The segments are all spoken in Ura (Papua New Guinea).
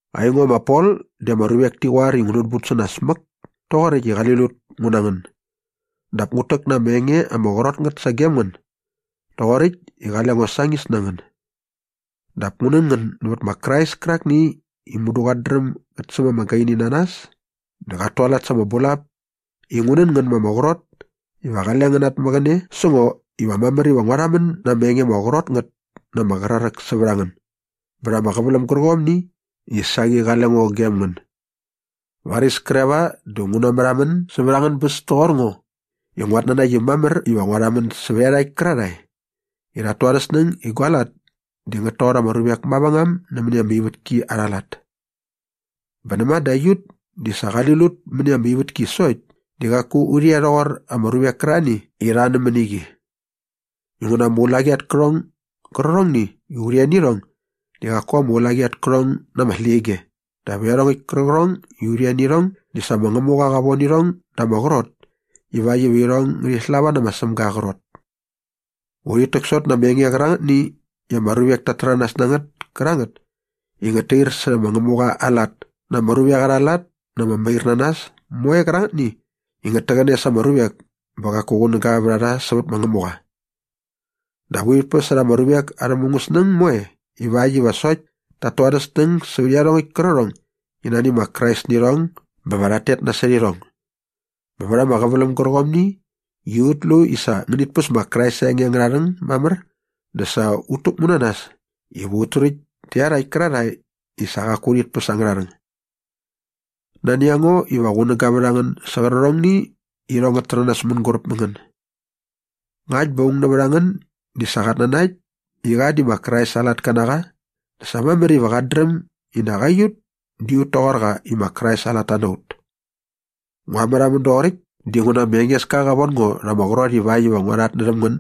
Aingo ma Pol di ama ruvek ti qoar i ngu nänbut sä nas mäk toqoräkt i qali lut ngu na ngän dap ngut täk na ama enge ama qrot ngät sagem ngän doqoräkt i qale ngo sañis na ngän. Dap ngu nän ngän nävät ma Krais kärakni i mudu dä qat dräm gät säm ama gaini na nas dä qat tualat sa ama bulap i ngu nän ngän ma ama qrot iva qale ngän namäqäne sä ngo iva mamär iva ngua rhamän na ama enge ama qrot ngät na ama qraräk sävät a ngän bät ama qäväläm gärqomni i saqi qale ngo gem ngän. Varis kre va dä ngu namärhamän sävät angän bäs toqor ngo i nguat nanakt i mamär iva ngua rhamän sävät iarhakt kärarhae i rhat tu arhä snäng i gua lat di ngät toqor ama ruvek mavängam nämäni ama ivätki arha lat. Bä näma dä aiut di sa qali lut mäni ama ivätki sokt di qaku urhi e rhoqor ama ruvek kärarhani i rha nämäni qi. Inguna ama ulaqi at kärhong gärqärhongni i urhi e nä irhong di qaku ama ulaqi at kärhong na ama släqyige dap iarhongäkt kärqärhong i urhi e nä irhong di sa ma Ngämuqa qa von irhong da ama qrot ivakt iva irhong ngärhi slava nä ma Sämga aa qrot. Urhit täksot na ama enge qärangätni i ama ruvek tat täranas na ngät kärangät i ngät tair särhä ma Ngämuqa aa lat ngä na ama ruvek arha lat na ama mairnanas moe kärangätni i ngät täqäne sa ama ruvek bä qaku qunäga vät a rha sävät ma Ngämuqa. Dap urhit päsärha ama ruvek arhä mungäsnäng moe ivakt iva sokt tat tu arhä snäng sävät iarhongäkt kärqärhong i nani ma Krais nä irhong bä va rhat tet nasot irhong. Bä vät ama qäväläm gärqomni i ut lu i sa ngänit päs ma Krais aa enge angärha rhäng mamär dä sa ut täkmu na nas iva ut turäkt tä iarhakt kärarhae i sa qaku rhit päs angärha rhäng. Nani a ngo iva qunäga vät a ngän sä qärqärhongni i irhong ngät täranas mänguräp mä ngän. Ngakt bä aung nävät a ngän di sa qat nanakt i qa di ma Krais aa latka na qa dä sa mamär iva qat dräm i nak aiut di ut toqor qa i ma Krais aa latta na ut. Ngua märhamän doqoräkt dinguna ma Engeska qa von ngo rha ama qrot ivakt iva ngua rhatnärhäm ngän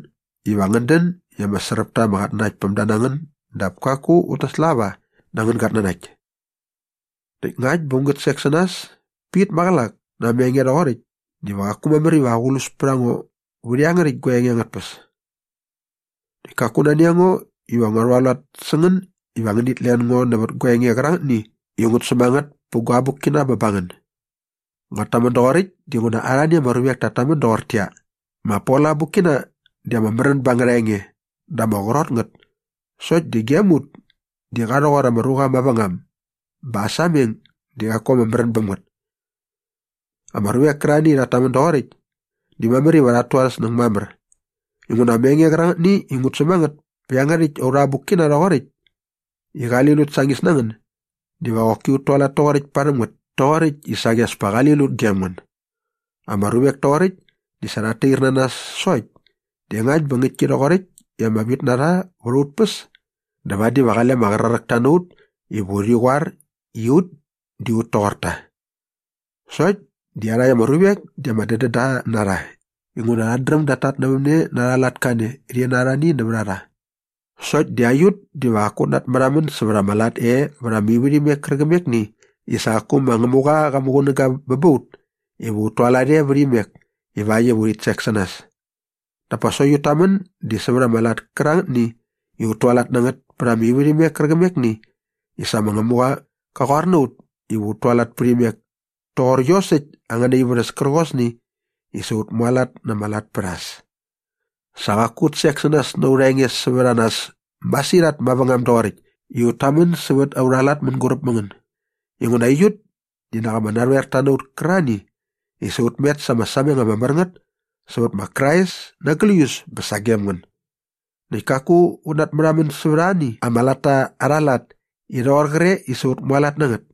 iva ngän dän i ama sräp ta ama qatnanaktpämda na ngän dap kaku va ut naslava na angän gatnanakt. Näkt ngakt bä ngu sek sä nas pit maqälak na ama enge rhoqoräkt diva qaku mamär iva aqlus pät a ngo vät iangärhäkt gua enge angät tpäs. Näkt kaku nani a ngo iva ngua rhualat sä ngän iva ngänit len ngo nävät gua enge qärangätni i ngut säm a ngät pä gua abukkina bä ba ngän. Nguat tamän doqoräkt dinguna arhani ama ruvek tat tamän doqortäqyia, “Ma Pol aa abukkina di ama märän ba angärha enge dä ama qrot ngät sokt di gem ut di qa rhoqor ama ruqa mavängam bä aa sameng di qaku ama märän bäm ngät.” Ama ruvek kärarhani i rhat tamän doqoräkt di mamär iva rhat tu arhä snäng mamär inguna ama enge qärangätni i ut säm a ngät pä iangärhäkt aurha abukkina rhoqoräkt i qali lut sañis na ngän diva qoki ut tualat toqoräkt parhäm ngät toqoräkt i saqi as pa qali lut gem ngän. Ama ruvek toqoräkt di sa rhat tair na nas sokt di ngakt bä ngäktki rhoqoräkt i ama vit na rha vät aut päs dä vadi va qale ama qraräkta na ut iva urhi qoar i ut di ut toqor ta. Sokt di iarhakt ama ruvek di ama dädända na rha inguna rhat dräm dat tatnävämne na arha lat kane rhi na arhani nävät a rha. Sokt di aiut diva qaku ut natmärhamän sävät ama lat e vät ama ivärhimek kärqämekni i sa qaku ma Ngämuqa qa muqunäga bä ba ut iva ut tualat e vät imek ivakt iva urhi sek sä nas. Dap pa sokt ut tamän di sävät ama lat kärangätni i ut tualat na ngät pät ama ivärhimek kärqämekni i sa ma Ngämuqa qa qoar na ut iva ut tualat pät imek toqor iosäkt angäna ivärhäs kärqosni i sa ut mualat na ama lat pät a äs. Sa qaku ut sek sä nas na aurha enge sävät a nas masirhat mavängam doqoräkt i ut tamän sävät aurha lat mänguräp mä ngän. Inguna aiut di nak ama narhoerta na ut kärarhani i sa ut met sa ama sameng ama mär ngät sävät ma Krais na gläius bä sagem ngän. Näkt kaku ut natmärhamän sävät arhani ama latta arha lat i rhoqor qre i sa ut mualat na ngät.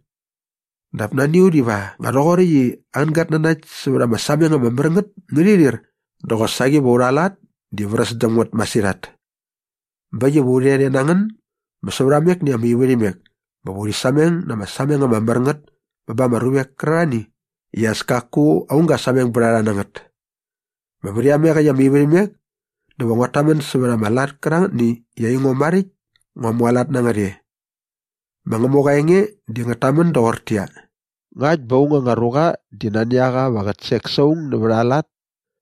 Dap nani a ut iva nga rhoqoräkt i angän gatnanakt sävät ama sameng ama mär ngät ngärhi rhir dä qosaqi va aurha lat di vräs däm ngät masirhat. Bä äkt iva u rhet e na ngän bä säva amekni ama ivärhimek bä va urhi sameng na ama sameng ama mär ngät bä ba ama ruvek kärarhani i as kaku aung ga sameng bät a rha na ngät. Bä vät iameqäkt ama ivärhimek dä va nguat tamän sävät ama lat kärangätni i aingo maräkt ngua mualat na ngät e. Ma Ngämuqa aa enge di ngät tamän doqortäqyia, “Ngakt bä aung anga ruqa di nani a qa iva qät sek sa aung nävät aa lat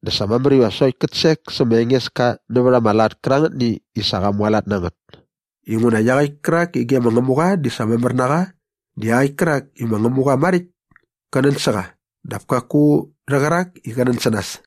dä sa mamär iva sokt kät sek sä ma Engeska nävät ama lat kärangätni i sa qa mualat na ngät.” Inguna iaqäkt kärak i ge ma Ngämuqa di sa mamär na qa di iaqäkt kärak i ma Ngämuqa maräkt kä nän sä qa dap kaku rhä qärak i qä nän sä nas.